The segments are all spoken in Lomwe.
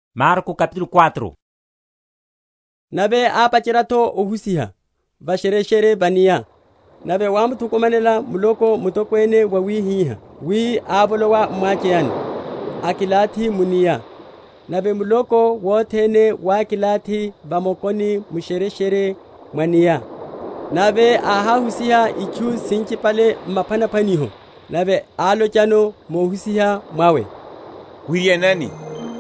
Niphwanaphwaniho na mulipa‐omisa. Nave ápacherya’tho ohusiha va’shereshere va’nia. Nave wámuthukumanela muloko mutokwene wawihihá wi ávolowa m’mwacheyani, akilathi mu’nia; nave muloko wothene wákilathi va mokoni mu’shereshere mwa’nia. Nave áháhusiha itchu sinchipale m’maphwanaphwaniho, nave álochano muhusiha mwawe, Wiryanani;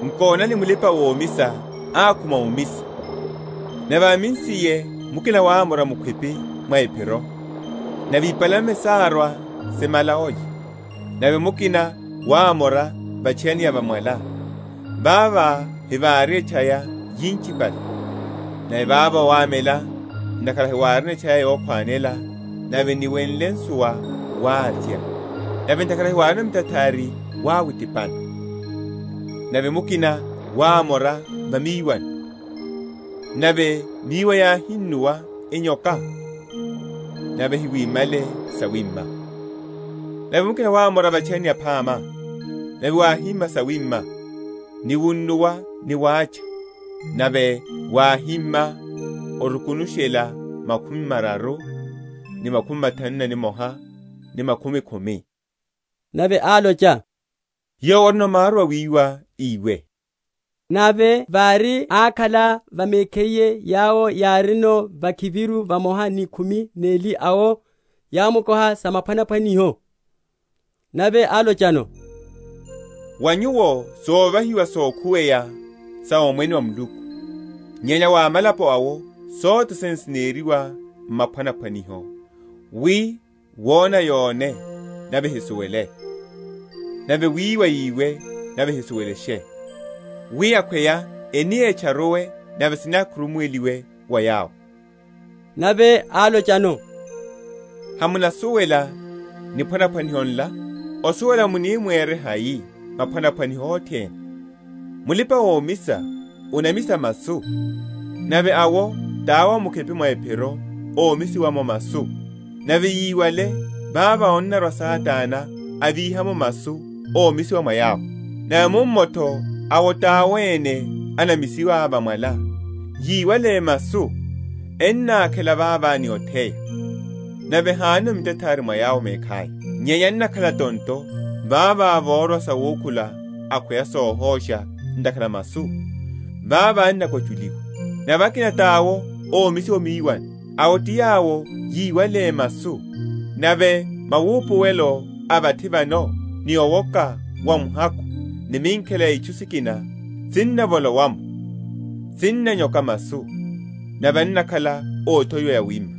Nkonani mulipa‐omisa ákhuma omisa; nave ámisiye, mukina wámora mukhwipi mwa’phiro, nave ipalame sárwa simala olya. Nave mukina wámora va’tchayani ya va mwala, vavo vahári etchaya yinchipale; nave vavo wámela, ntakhara hawárino etchaya yokhwanela; nave niwenle nsuwa, wávya; nave ntakhara hawárino mitathari wáwitipana. Nave mukina wámora va miwani, nave miwa yáhunnuwa, enyoka, nave hawimihale sawima. Nave mukina wámora va’tchayani yaphama; nave wáhimiha sawima, ni wunnuwa ni wacha; nave wáhima orukunushela makhumi mararu, ni makhumi mathanu na nimoha, ni makhumi khumi. Nave álocha, Yowo orino maru awiwa, íwe. Nave vári ákhala va mekhiye yawo yárino vakhiviru vamoha ni khumi neli awo yámukoha sa maphwanaphwaniho. Nave álochano, Wa nyuwo sovahiwa sokhuweya sa Omwene wa Muluku; nyenya wa amalapo awo sothene sineriwa m’maphwanaphwaniho; wi wona yone nave ehisuwele; nave wiwa yiwe nave ehisuwelashe; wi akhweya eni etcharuwe nave sinakhurumuweliwe wa yawo. Nave álochano, Hamunasuwela niphwanaphwaniho nla? Osuwela muni mwere hai maphwanaphwaniho othene? Mulipa‐omisa anamisa masu. Nave awo tawo a mukhwipi mwa’phiro momisiwa’mo masu; nave yiwale, vavo annarwa Satana avíha’mo masu omisiwa mwa yawo. Nave mummo’tho awo tawo ene enamisiwa va mwala, yíwale masu ennakhela vavo ni otheya; nave hanono mitathari mwa yawo mekhaya, nyenya ennakhala tonto; vavo vorwa sawukhula akhweya sohosha ntakhara a masu, vavo ennakwachuliwa. Nave akina tawo omisiwa o miwani; awo ti yawo yíwale masu, nave maupuwelo a vathi vano ni owoka wa muhakhu ni minkhela ya itchu sikina, sinnavolowa’mo, sinanyoka masu, nave ennakhala othowiwa yawima.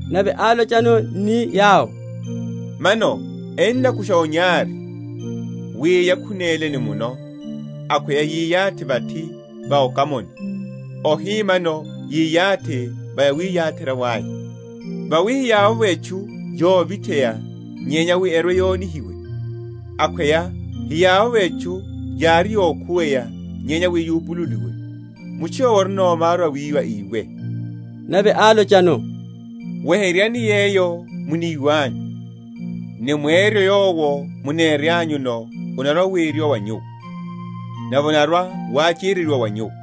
Nave álocha ni yawo, Mano ennakusha onyari wi yakhunéle ni muno, akhweya yiyathi vathi va okamani, ohi mano yiyathi va yawiyatherya’vo aya. Vawi heyavovo etchu yovitheya nyenya wi erwe‐yonihiwe; akhweya heyavovo etchu yári yokhuweya nyenya wi yupululiwe. Mutchu yowo orino maru awiwa, íwe. Nave álochano, Weheryani yeyo muniwanyu, ni mweryo yowo muneryanyuno, onarwa‐weryiwa wa nyuwo; nave onarwa‐wachereryiwa wa nyuwo.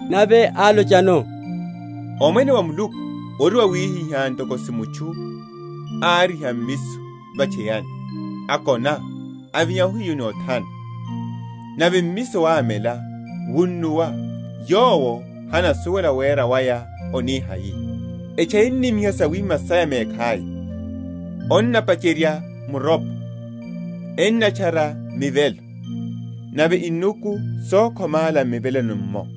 Nave álochano, Omwene wa Muluku ori wawihihá, ntoko si mutchu áriha mmiso va’tchayani; akona, avinya ohiyu ni othana, nave mmiso wámela, wunnuwa, yowo hanasuwela wera waya oni hai. Etchaya enimiha sawima saya mekhaya; onapacherya muropo, enatchara mivelo, nave inuku sokhomála m’miveloni’mmo.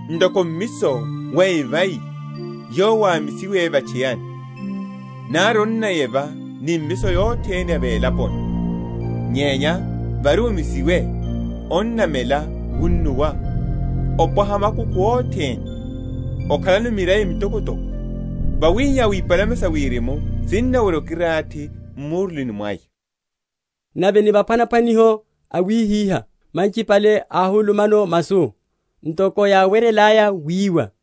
Ntoko mmiso wa evai yowo wámisiwe va’tchayani, nari onnayeva ni mimiso yothene ya velaponi, nyenya vári omisiwe, onnamela wunnuwa, opwaha makukhu othene, okhalano mirai mitokotoko; wawihihá wi ipalame sa wirimu sinnawerya okilathi m’murulini mwaya. Nave ni maphwanaphwaniho awihiha’la manchipale áhulumano masu, ntoko yáweryelaya wiwa;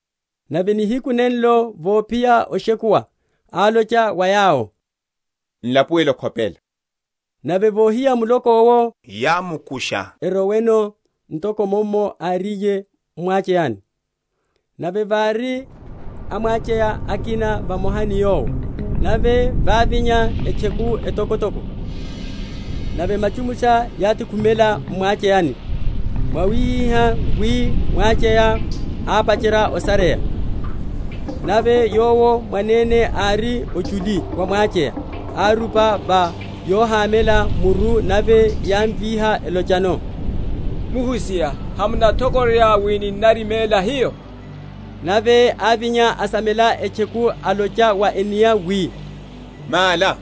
Nave nihiku nenenlo, vophiya oshekuwa, álocha wa yawo, N’lapuwele okhopela. Nave vohiya muloko’wo, yámukusha eroweno, ntoko mummo áriye m’mwacheyani. Nave vári amwacheya akina vamoha ni Yowo. Nave vávinya etcheku etokotoko, nave machumusha yátekhumela m’mwacheyani, mwawihihá wi mwacheya ápacherya osareya. Nave Yowo mwanene ári ochuli wa mwacheya, arupa va yohamela muru; nave yámvíha elochano, Muhusiha, hamunathokororya wi n’nariméla hiyo? Nave ávinya, asamela etcheku alocha wa enia wi, Mála,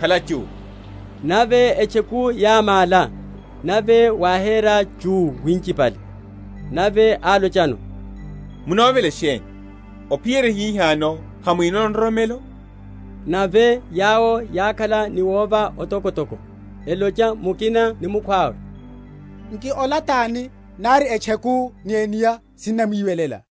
khala chuu. Nave etcheku yámála, nave wáhera chuu winchipale. Nave álochano, Munovela sheni? ophiyerya hihano hamwinono nroromelo? Nave yawo yákhala ni wova otokotoko, elocha mukina ni mukhwawe, Nki ola tani, nari etcheku ni enia sinnamwiwelela.